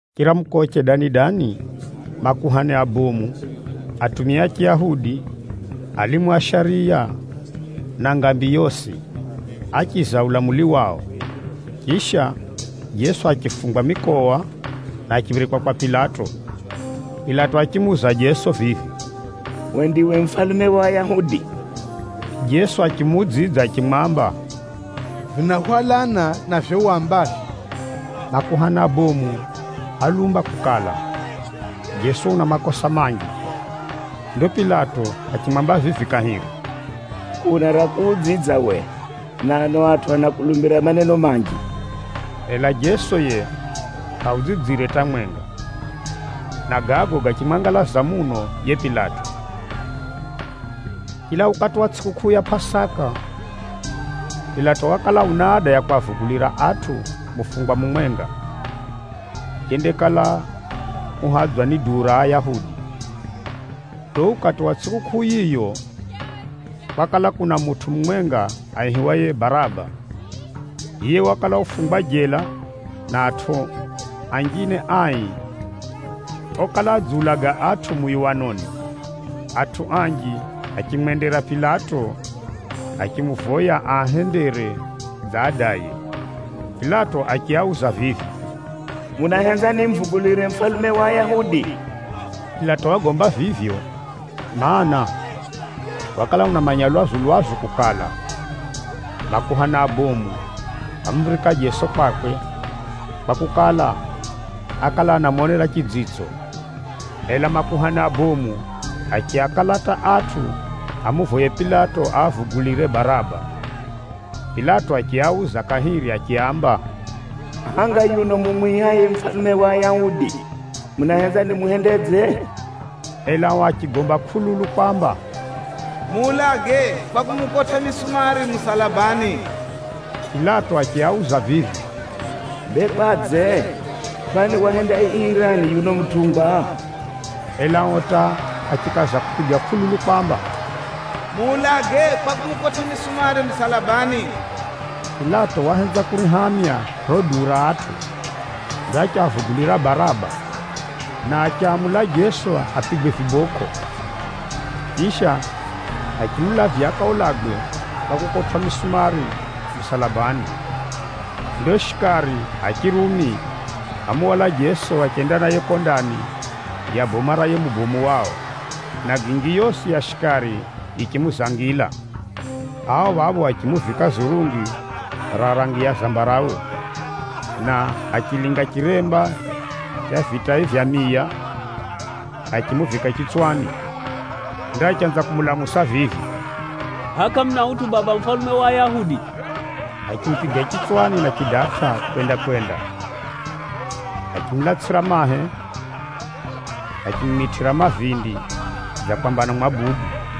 Chiramukoche dani-dani, makuhani abomu, atumia a Chiyahudi, alimu a shariya na ngambi yosi, áchiza ulamuli wao. Chisha, Jeso achifungwa mikowa, na achiphirikwa kwa Pilato. Pilato achimuuza Jeso vivi, “Uwe ndiwe mufalume wa Ayahudi?” Jeso achimuudzidza achimwamba, “Vinahwalana na vivyo wambavyo.” Makuhani abomu álumba kukala, Jeso una makosa manji. Ndo Pilato achimwamba vivi kahiri, “Kʼuna ra kuudzidza uwe, na ano atʼu anakulumbira maneno manji?” Ela Jeso yiye kʼaudzidzire hata mwenga, na gago gachimwangalaza muno yiye Pilato. Chila ukati wa tsʼikukʼuu ya Pʼasaka, Pilato wakala una ada ya kwavugulira atʼu mufungwa mumwenga, yendakala uhadzwa ni duu ra Ayahudi. Ndo ukati wa tsʼikukʼuu yiyo, kwakala kuna mutʼu mumwenga aihiwaye Baraba. Yiye wakala ufungwa jela na atʼu anjine ai okala adziulaga atʼu muyuwanoni. Atʼu anji achimwendera Pilato, achimuvoya aahendere dza adaye. Pilato achiauza vivi, “Munahenza nimuvugulire mufalume wa Ayahudi?” Pilato wagomba vivyo, mana, wakala unamanya lwazu-lwazu kukala, makuhani abomu ámuphirika Jeso kwakwe, kwakukala, ákala anamonera chidzitso. Ela makuhani abomu achiakalata atʼu amuvoye Pilato aavugulire Baraba. Pilato achiauza kahiri achiaamba, “Hʼanga yuno mumwihaye ‘Mufalume wa Ayahudi,’ munahenza nimuhendedze?” Ela ao achigomba kʼululu kwamba, “Muulage kwa kumukotʼa misumari musalabani!” Pilato achiauza vivi, “Bee kwadze? Kwani wahenda ii rani yuno mutʼungwa?” Ela ao hata achikaza kupiga kʼululu kwamba, “Muulage kwa kumukotʼa misumari musalabani!” Pilato wahenza kurihamya riro duu ra atʼu. Ndo achiavugulira Baraba, na achamula Jeso apigwe vibokʼo. Chisha, achimulavya akaulagwe kwa kukotwʼa misumari musalabani. Ndo shikari a Chirumi ámuhwala Jeso achenda naye kuko ndani ya boma ra yiye mubomu wao, na gingi yosi ya shikari yichimuzangila. Ao phapho achimuvika zurungi ra rangi ya zambarawe, na achilinga chiremba cha vitai vya miya, achimuvika chitswani. Ndo achanza kumulamusa vivi, “Hʼaya kʼamuna utʼu baba mufalume wa Ayahudi?” Achimupiga chitswani na chidatʼa kwenda-kwenda, achimulatsʼira mahe, na achimumitʼira mavindi dza kwamba anamwabudu.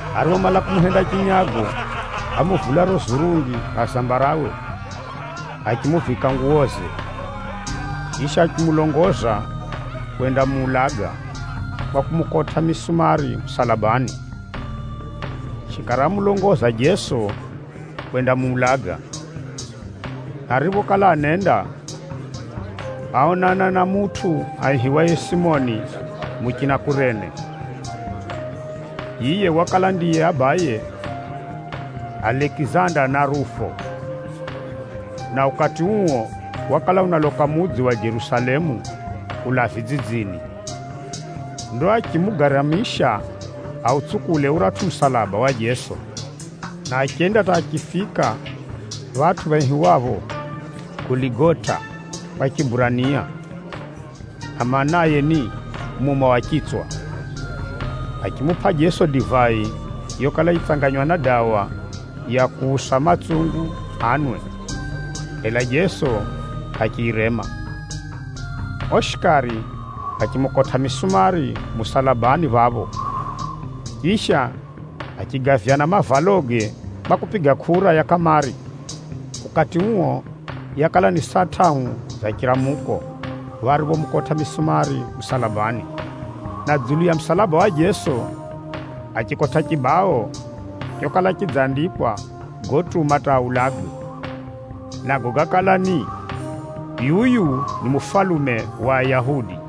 Ariphomala kumuhenda chinyago, ámuvula riro zurungi ra zambarawe, achimuvika nguwoze. Chisha, achimulongoza kwendamuulaga kwa kumukotʼa misumari musalabani. Shikari ámulongoza Jeso kwendamuulaga. Na ariphokala anenda, áonana na mutʼu aihiwaye Simoni muchina Kurene. Yiye wakala ndiye abaye Alekizanda na Rufo, na ukati uo wakala unaloka mudzi wa Jerusalemu kulaa vidzidzini. Ndo achimugaramisha autsukule uratʼu musalaba wa Jeso, na achenda hata achifika phatʼu phaihiwapho Goligota kwa Chiburania, na maanaye, ni “Muma wa Chitswa.” Achimupʼa Jeso divai yokala yitsanganywa na dawa ya kuusa matsungu anwe, ela Jeso achiyirema. Ao shikari achimukotʼa misumari musalabani phapho. Chisha, achigavyana mavaloge kwa kupiga kʼura ya kʼamari. Ukati uo yakala ni saa tʼahu za chiramuko phapho ariphomukotʼa misumari musalabani. Na dzulu ya musalaba wa Jeso, achikotʼa chibao chokala chidzandikwa gotuma hata aulagwe. Nago gákala ni, “yuyu ni mufalume wa ayahudi.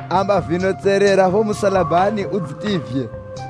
Amba vino tserera phapho musalabani udzitivye!”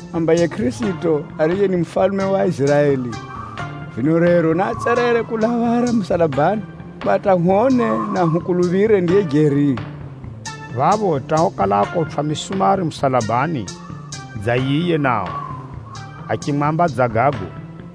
Amba yiye Kʼirisito, ariye ni mufalume wa Aiziraeli, vino rero naatserere kulaa phara musalabani kwa hata hwone na hukuluphire ndiye jeri.” Phapho hata okala akotwʼa misumari musalabani dza yiye nao, achimwamba dza gago.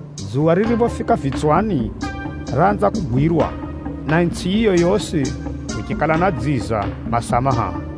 Dzuwa ririphofika vitswani, raanza kugwirwa, na itsʼi yiyo yosi kuchikala na dziza masaa mahahu.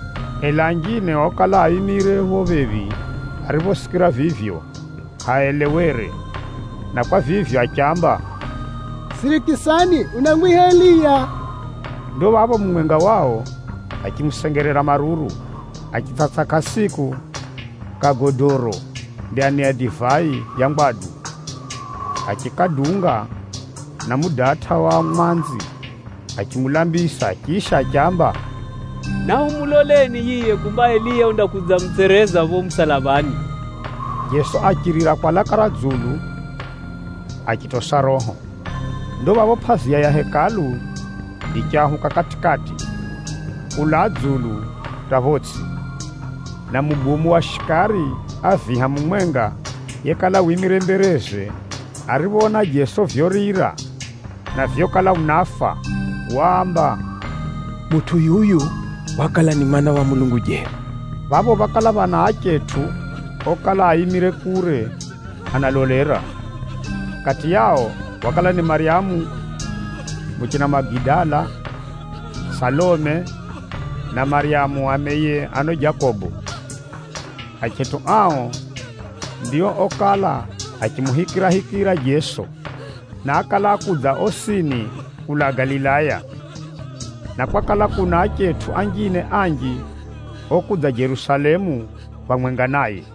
Ela anjine okala aimire phapho phephi ariphosikira vivyo kʼaaelewere, na kwa vivyo achiamba, “Sirikisani, unamwiha Eliya.” Ndo phapho mumwenga wao achimusengerera maruru, achitsʼatsʼa kasiku ka godoro ndani ya divai ya ngwadu, achikadunga na mudatʼa wa mwanzi, achimulambisa chisha achiamba, “Nahumuloleni yiye kumba Eliya undakudzamutsereza phapho musalabani.” Jeso achirira kwa laka ra dzulu, achitosa roho. Ndo phapho pʼaziya ya Hekalu yichahuka kati-kati, kulaa dzulu hata photsʼi. Na mubomu wa shikari a viha mumwenga yekala wimire mbereze ariphoona Jeso vyorira na vyokala unafa, waamba, “Mutʼu yuyu wakala ni Mwana wa Mulungu jeri.” Phapho phákala phana achetʼu okala aimire kure analolera. Kati yao, wakala ni Maryamu muchina Magidala, Salome phamwenga na Maryamu ameye Jose na ano Jakobo. Achetʼu ao ndio okala achimuhikirahikira Jeso, na ákala akudza osini kulaa Galilaya. Na kwakala kuna achetʼu anjine anji okudza Jerusalemu phamwenga naye.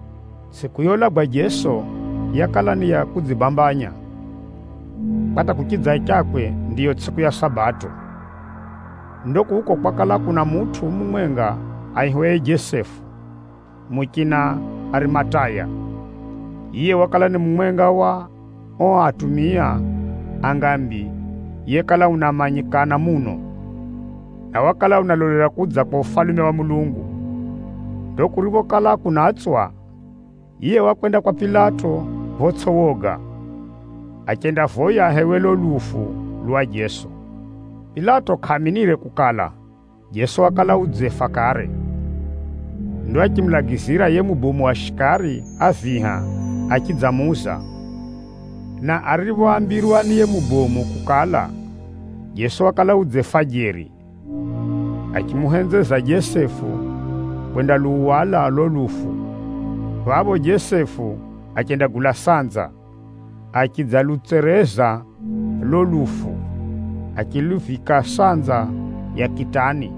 Tsʼiku youlagwa Jeso, yakala ni ya kudzibambanya, kwa hata kuchidzachakwe ndiyo tsʼiku ya Sabato. Ndo kuko kwakala kuna mutʼu mumwenga aihiwaye Jesefu, muchina Arimataya. Yiye wakala ni mumwenga wa ao atumia a ngambi yekala unamanyikana muno, na wakala unalolera kudza kwa Ufalume wa Mulungu. Ndo kuriphokala kunatswa, yiye wakwenda kwa Pilato photsʼi woga, achendavoya ahewe lulo lufu lwa Jeso. Pilato kʼaaminire kukala, Jeso wakala udzefa kare. Ndo achimulagizira yiye mubomu wa shikari a viha achidzamuuza. Na ariphoambirwa ni yiye mubomu kukala, Jeso wakala udzefa jeri, achimuhenzeza Jesefu kwendaluhwala lulo lufu. Phapho Jesefu achendagula sanza. Achidzalutsereza lulo lufu, achiluvika sanza ya kitani,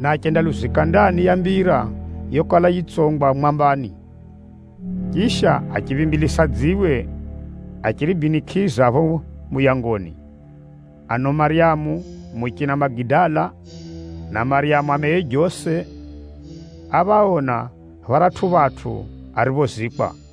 na achendaluzika ndani ya mbira yokala yitsongwa mwambani. Chisha, achiphimbilisa dziwe achiribinikʼiza phapho muyangoni. Ano Maryamu muchina Magidala, na Maryamu ameye Jose, áphaona pharatʼu phatʼu ariphozikwa.